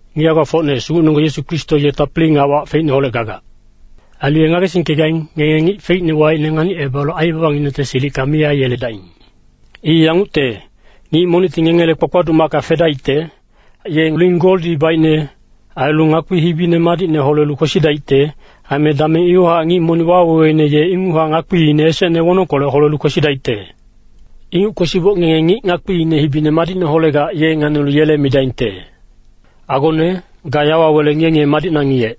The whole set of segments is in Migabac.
Ngic hae-gbafocne, Sugucnenonggeng Yesu Kristo ye tapili nga wac feicneholec gagac. Ailu ye ngagesingkegaing, ngenge ngic feicne waicne nganicebalu aibabanginengte silicka mi aiyeledaing. I yangucte, ngic monicti ngengele kpakpaduc macka fedaicte. Ye ling goldi baicne, ailu ngakpi hibine madicne holelu kwesidaicte. Aime dameng iwahac ngic monic waweweine ye inguchac ngakpiine esecne wonongkolec holelu kwesidaicte. Inguc kwesiboc ngenge ngic ngakpiine hibine madicne holegac, ye nganilu yele midaingte, “Agone, ga yawa wele ngiye-ngiye madicna ngiyec.”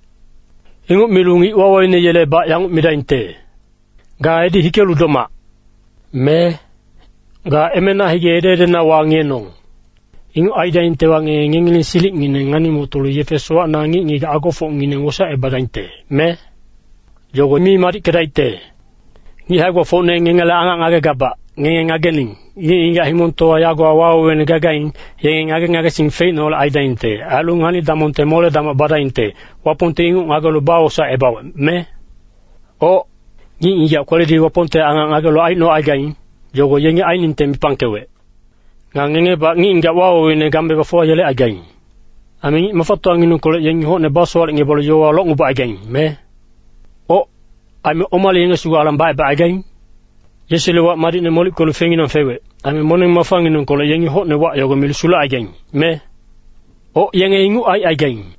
Inguc milu ngic waweweine yelebac yanguc midaingte, “Ga edi hikelu domac,” me “Ga emena hige ede-edena wangiyenong.” Inguc aidaingtewa, ngenge ngengileng silicngineng ngani-motolu yefe sowacna ngic-ngigac agofocngineng wosaecebadaingte, me? Yogo mi madickedaicte. Ngic hae-gbafocne ngengele angac ngagegabac, ngenge ngagening. Ngic-ngigac himongtowa yagowa waweweine gagaing, yenge ngage-ngagesing feicneholec aidaingte. Ailu ngani-damongte mole-damoc badaingte. Wapongti inguc ngagelu bawosaecebawec, me? Oc. Ngic-ngigac kweledi Wapongte angac ngagelu aicnocaigaing, yogo yengi ainingte mipangkewec. Nga ngengebac ngic-ngigac waweweine game bafuwayelecaigaing. Aime ngic mafatowanginengkolec yengi hocne basowalecngebalu yowawa locngebacaigaing, me? Oc, aime omale yenge sugu alang bacebacaigaing? Yesule wac madicne molickelu feinginang fewec. Aime moneng-mafanginengkolec yengi hocne wac yogo milu sulecaigaing, me? Oc, yenge inguc aicaigaing.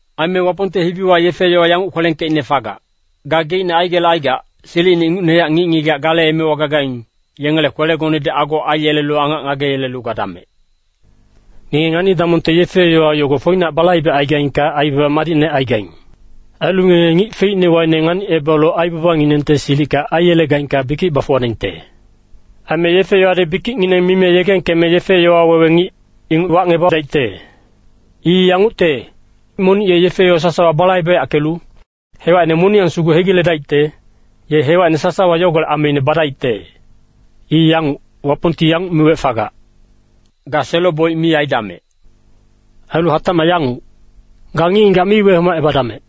Aime Wapongte hibiwa yefe-yowa yanguc kwelengkeicne fagac, “Gageicne aigelecaigac, silicine ingucnehac ngic-ngigac gale emewa gagaing, yengele kwelegonedi ago aiyelelu angac ngageyelelu gadamec.” Ngenge ngani-damongte yefe-yowa yogo foinac balaibecaigaingka, aibaba madicne aigaing. Ailu ngenge ngic feicne waicne nganicebalu aibabanginengte silicka aiyelegaingka bikic bafuwadaingte. Aime yefe-yowadi bikicngineng mime yegengkeme yefe-yowa wewe ngic, inguc wacngebadaicte. I yangucte, monic ye yefe-yowa sasawa balaibeyackelu, hewacine moniyang sugu hegiledaicte, ye hewacine sasawa yogolec ameine badaicte. I yanguc, Wapongti yanguc miwec fagac, “Ga selo-boic mi aidamec.” Ailu hatacmac yanguc, “Ga ngic-ngigac mi wehomacebadamec.”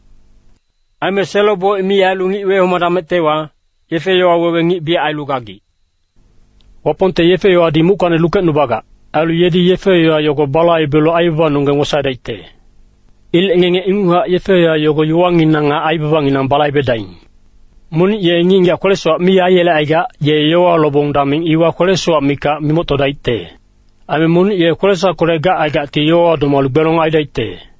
Aime selo-boic mi ailu ngic wehomadamectewa, yefe-yowa wewe ngic biyac ailu gagic. Wapongte yefe-yowadi muckacni lukecnubagac. Ailu yedi yefe-yowa yogo balaibelu aibabanonggeng wosaedaicte. Ilec ngenge inguchac yefe-yowa yogo yowanginang nga aibabanginang balaibedaing. Monic ye ngic-ngigac kwele-sowac mi aiyelecaigac, ye yowawa lobong dameng iwa kwele-sowac mikac mimoctodaicte. Aime monic ye kwele-sowackolec gacaigacti yowawa domalu gbelong aidaicte.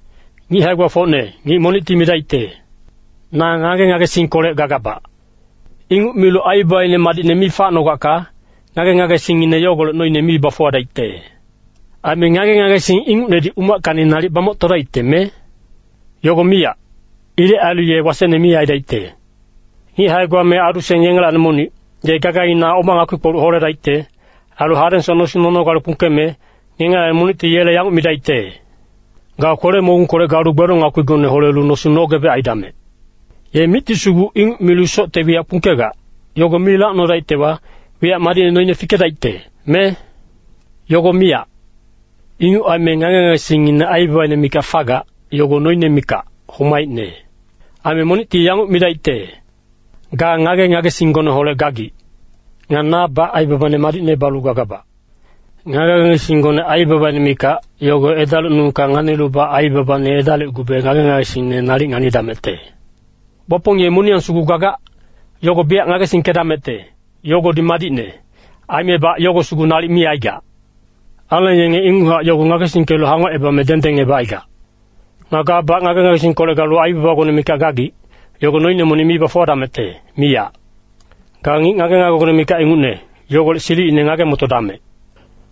Ngic hae-gbafocne, ngic monicti midaicte, “Na ngage-ngagesingkolec gagabac.” Inguc milu aibabaine madicne mi facnogacka, ngage-ngagesingngine yogolec noine mi bafuwadaicte. Aime ngage-ngagesing ingucnedi umackacni nalic bamoctodaicte, me? Yogo miyac. Ilec ailu ye wasecne mi aidaicte. Ngic hae-gba me adu-seng yengelacni monic, ye gagaina oma ngakpi-kpoluc holedaicte? Ailu hadengsoc nosing nonogale kpungkeme, ngengelacni monicti yele yanguc midaicte, “Ga kwele-mogungkolec galu gbelong ngakpigone holelu nosing nogebec aidamec.” Ye micti sugu inguc milu socte wiyacka kpungkegac, yogo mi lacnodaictewa, wiyac madicne noine fikedaicte, me? Yogo miyac. Inguc aime ngage-ngagesingine aibabaine mikac fagac, yogo noine mikac, homaicne. Aime monicti yanguc midaicte, “Ga ngage-ngagesinggoneholec gagic. Nga nabac aibabane madicne balu gagabac.” Ngage-ngagesinggone aibabaine mikac, yogo edalicnungka nganilubac, aibabane edalicgube ngage-ngagesingne nalic nganidamecte. Wapong ye moniyang sugu gagac, yogo biyac ngagesingkedamecte, yogodi madicne. Aimebac yogo sugu nalic mi aigac. Aleng yenge inguchac yogo ngagesingkelu hangocebame dengdengebacaigac. Nga gabac ngage-ngagesingkolec galu aibabagone mikac gagic, yogo noine monic mi bafuwadamecte, miyac. Ga ngic ngage-ngagegone mikac ingucne, yogolec silicine ngage-motodamec.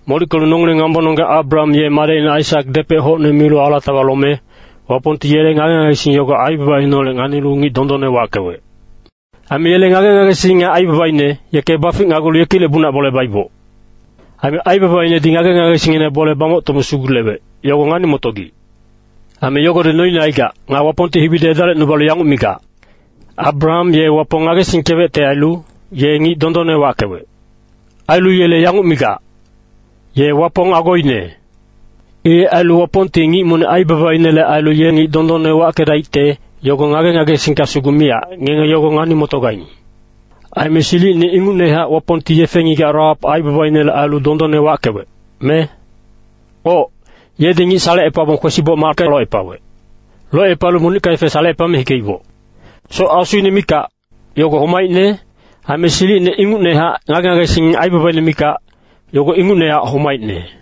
Molickelu nongileng ngambononggeng Abraham ye madecine Aisak depec hocne milu alatawa lome, Wapongti yele ngage-ngagesing yogo aibabaineholec nganilu ngic dondonne wackewec. Aime yele ngage-ngagesing nga aibabaine, yeke baficnagulu yekilec momochac bole baiboc. Aime aibabainedi ngage-ngagesinginele bole bamoctome sugulewec, yogo ngani-motogic. Aime yogodi noine aigac. Nga Wapongte hibidi edalicnubalu yanguc migac, “Abraham ye Wapong ngagesingkewecte ailu, ye ngic dondonne wackewec.” Ailu yele yanguc migac, “Ye Wapong agoine.” Ilec ailu Wapongti ngic monic aibabainele ailu ye ngic dondonne wackedaicte, yogo ngage-ngagesingka sugu miyac, ngenge yogo ngani-motogaing. Aime silicine ingucnehac Wapongti yefe-ngigac Rahap aibabainele ailu dondonne wackewec, me? Oc, yedi ngic salecepabong kwesiboc macka locepawec. Locepalu monicka yefe salecepame hikeiboc. Soc asuine mikac, yogo homaicne. Aime silicine ingucnehac ngage-ngagesing aibabaine mikac, yogo ingucnehac homaicne.